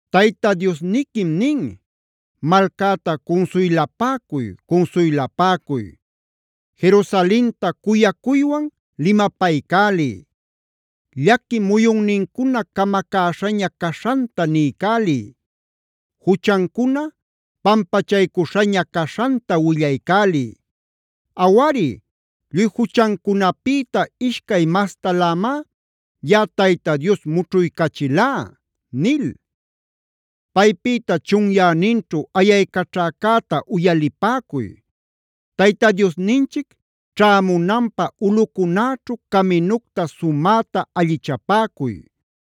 Tayta Diosniquim nin: “Malcäta cunsuylapäcuy, cunsuylapäcuy. Jerusalenta cuyacuywan limapaycäliy. Llaqui muyunnincuna camacäśhaña caśhanta niycäliy; juchancuna pampachaycuśhaña caśhanta willaycäliy. Awari, lluy juchancunapïta ishcay mastalämá yaꞌa Tayta Dios mućhuycachilá” nil. Paypïta chunyäninćhu ayaycaćhäcäta uyalipäcuy: “Tayta Diosninchic ćhämunanpä ulꞌucunäćhu caminucta sumäta allichapäcuy.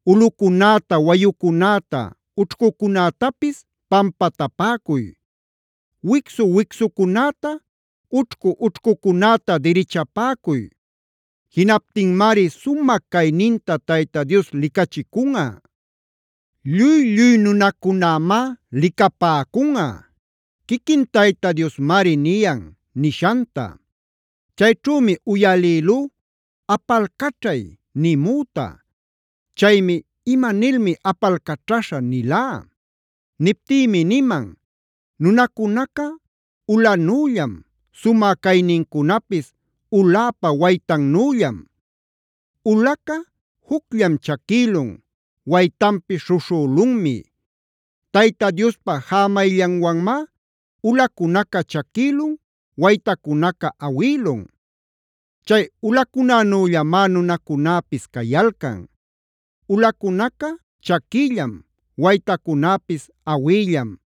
Ulꞌucunäta, wayucunäta, ućhcucunätapis pampatapäcuy; wicsu-wicsucunäta, ućhcu-ućhcucunäta dirichapäcuy. Jinaptinmari sumä cayninta Tayta Dios licachicunꞌa; lluy-lluy nunacunämá licapäcunꞌa.b Quiquin Tayta Diosmari niyan” nishanta. Chayćhümi uyalïlú “¡Apalcaćhay!” nimüta. Chaymi: “¿Ima nilmi apalcaćhaśha?” nilá. Niptïmi niman: “Nunacunaca ulanüllam. Sumä caynincunapis uläpa waytannüllam. Ulaca jucllam chaquïlun; waytanpis śhuśhülunmi. Tayta Diospa jämayllanwanmá ulacunaca chaquïlun, waytacunaca awïlun. Chay ulacunänüllamá nunacunäpis cayalcan. Ulacunaca chaquïllam; waytacunäpis awïllam;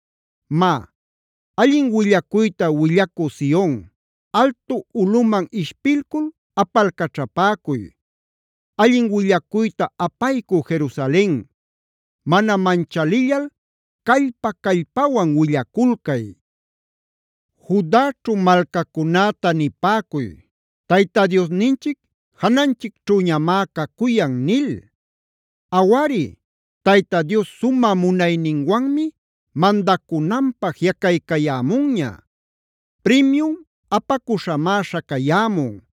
Má, ¡allin willacuyta willacü Sion, altu ulꞌuman ishpilcul apalcaćhapäcuy! ¡Allin willacuyta apaycü Jerusalen, mana manchalillal callpa-callpawan willaculcay! Judaćhu malcacunäta nipäcuy: “Tayta Diosninchic jananchicćhüñamá cacuyan” nil. Awari, Tayta Dios sumä munayninwanmi mandacunanpä jiꞌacaycayämunña. Primiun apacuśhamá śhacayämun;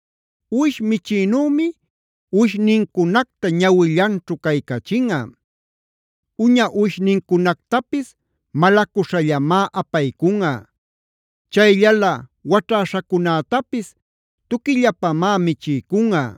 Uwish michïnümie uwishnincunacta ñawillanćhu caycachinꞌa. Uña uwishnincunactapis malacuśhallamá apaycunꞌa. Chayllalä waćhäśhacunätapis tuquillapamá michiycunꞌa.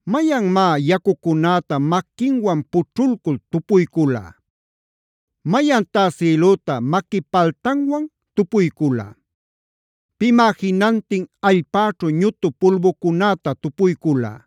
¿Mayanmá yacucunäta maquinwan pućhulcul tupuycula? ¿Mayantá sïlüta maqui paltanwan tupuycula? ¿Pimá jinantin allpäćhu ñutu pulbucunäta tupuycula?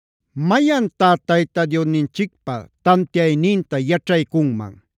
¿Mayantá Tayta Diosninchicpa tantiayninta yaćhaycunman?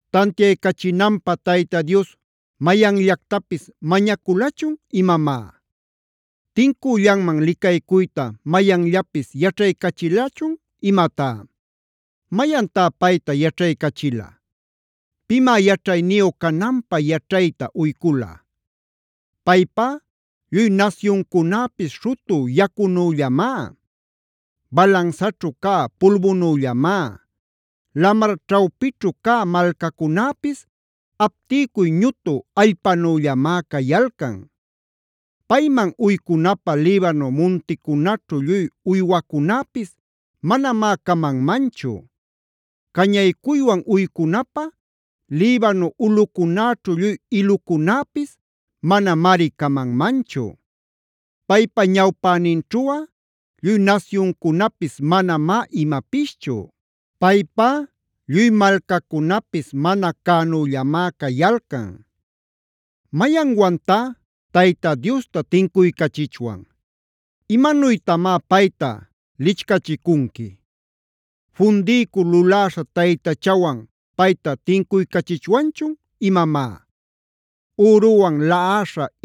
¿Tantiaycachinanpä Tayta Dios mayanllactapis mañaculachun imamá? ¿Tincüllanman licaycuyta mayanllapis yaćhaycachilachun imatá? ¿Mayantá payta yaćhaycachila? ¿Pimá yaćhayniyu cananpä yaćhayta uycula? Paypá lluy nasyuncunäpis śhutü yacunüllamá; balansaćhu cä pulbunüllamá; lamar ćhawpićhu cä malcacunäpis aptiycuy ñutu allpanüllamá cayalcan. Payman uycunapä Libano munticunaćhu lluy uywacunäpis manamá camanmanchu; cañaycuywan uycunapä Libano ulꞌucunäćhu lluy ilucunäpis manamari camanmanchu. Paypa ñawpäninćhuꞌa lluy nasyuncunapis manamá imapischu. Paypá lluy malcacunapis mana cänüllamá cayalcan. ¿Mayanwantá Tayta Diosta tincuycachichwan? ¿Imanuytamá payta lichcachicunqui? ¿Fundiycul luläśha taytachawan payta tincuycachichwanchun imamá? ¿Üruwan laꞌaśha,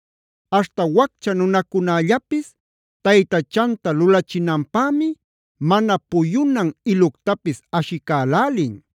Aśhta waccha nunacunällapis taytachanta lulachinanpämi mana puyunan iluctapis ashicälälin.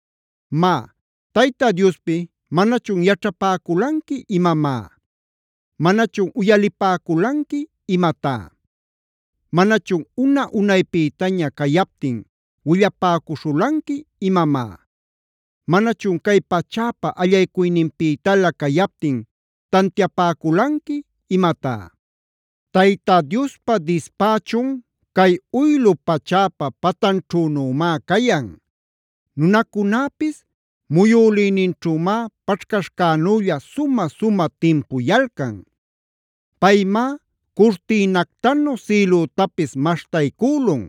Má, Tayta Diospi ¿manachun yaćhapäculanqui imamá? ¿Manachun uyalipäculanqui imatá? ¿Manachun una-unaypïtaña cayaptin willapäcuśhulanqui imamá? ¿Manachun cay pachäpa allaycuyninpïtalä cayaptin tantiapäculanqui imatá? Tayta Diospa dispächun cay uylu pachäpa patanćhünümá cayan; nunacunäpis muyülïninćhümá paćhcaśhcänülla sumä-sumä timpuyalcan. Paymá curtïnactanu sïlütapis maśhtaycülun;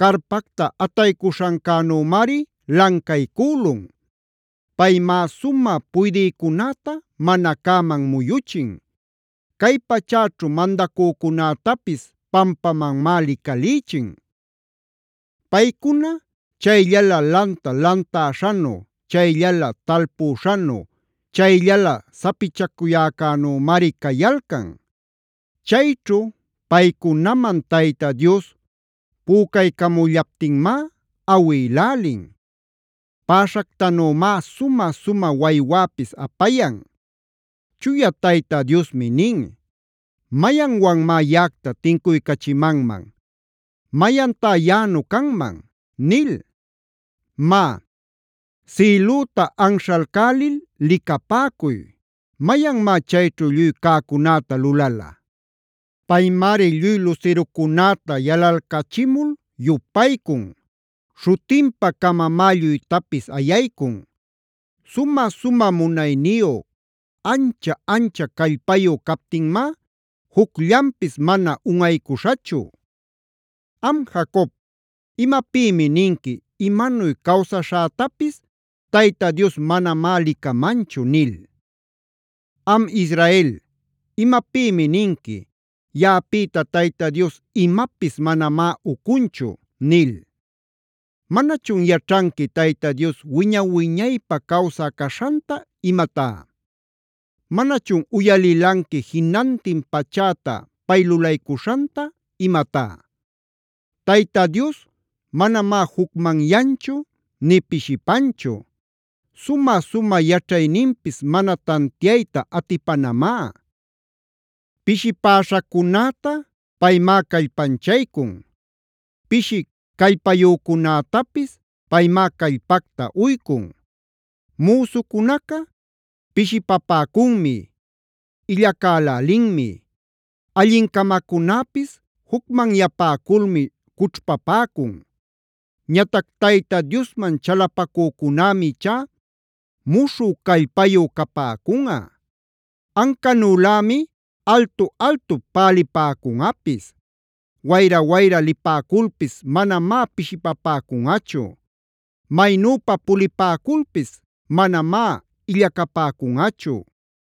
carpacta ataycuśhancänümari lancaycülun. Paymá sumä puydïcunäta mana cäman muyuchin; cay pachäćhu mandacücunätapis pampamanmá licalïchin. Paycuna chayllala lanta lantäśhanu, chayllala talpüśhanu, chayllala sapichacuyäcänümari cayalcan. Chayćhu paycunaman Tayta Dios pücaycamullaptinmá awïlälin; päśhactanümá sumä-sumä waywäpis apayan. Chuya Tayta Diosmi nin: “¿Mayanwanmá yaꞌacta tincuycachimanman? ¿Mayantá yaꞌanu canman?” nil. Má, sïlüta anśhalcälil licapäcuy. ¿Mayanmá chayćhu lluy cäcunäta lulala? Paymari lluy lusirucunäta yalalcachimul yupaycun; śhutinpa-camamá lluytapis ayaycun; Sumä-sumä munayniyu, ancha-ancha callpayu captinmá jucllanpis mana unꞌaycuśhachu. Am Jacob, ¿imapïmi ninqui “imanuy cawsaśhätapis Tayta Dios manamá licamanchu” nil? Am Israel, ¿imapïmi ninqui “yaꞌapïta Tayta Dios imapis manamá ucunchu” nil? ¿Manachun yaćhanqui Tayta Dios wiña-wiñaypä cawsä caśhanta imatá? ¿Manachun uyalilanqui jinantin pachäta pay lulaycuśhanta imatá? Tayta Dios manamá jucmanyanchu nï pishipanchu. Sumä-sumä yaćhayninpis mana tantiayta atipanamá. Pishipäśhacunäta paymá callpanchaycun; pishi callpayücunätapis paymá callpacta uycun. Müsucunaca pishipapäcunmi, illacälälinmi; allincamacunäpis jucmanyapäculmi cućhpapäcun. Ñatac Tayta Diosman chalapacücunämij ichá muśhü callpayu capäcunꞌa; ancanülämi altu-altup palipäcunꞌapis.k Wayra-wayra lipäculpis manamá pishipapäcunꞌachu; maynüpa pulipäculpis manamá illacapäcunꞌachu.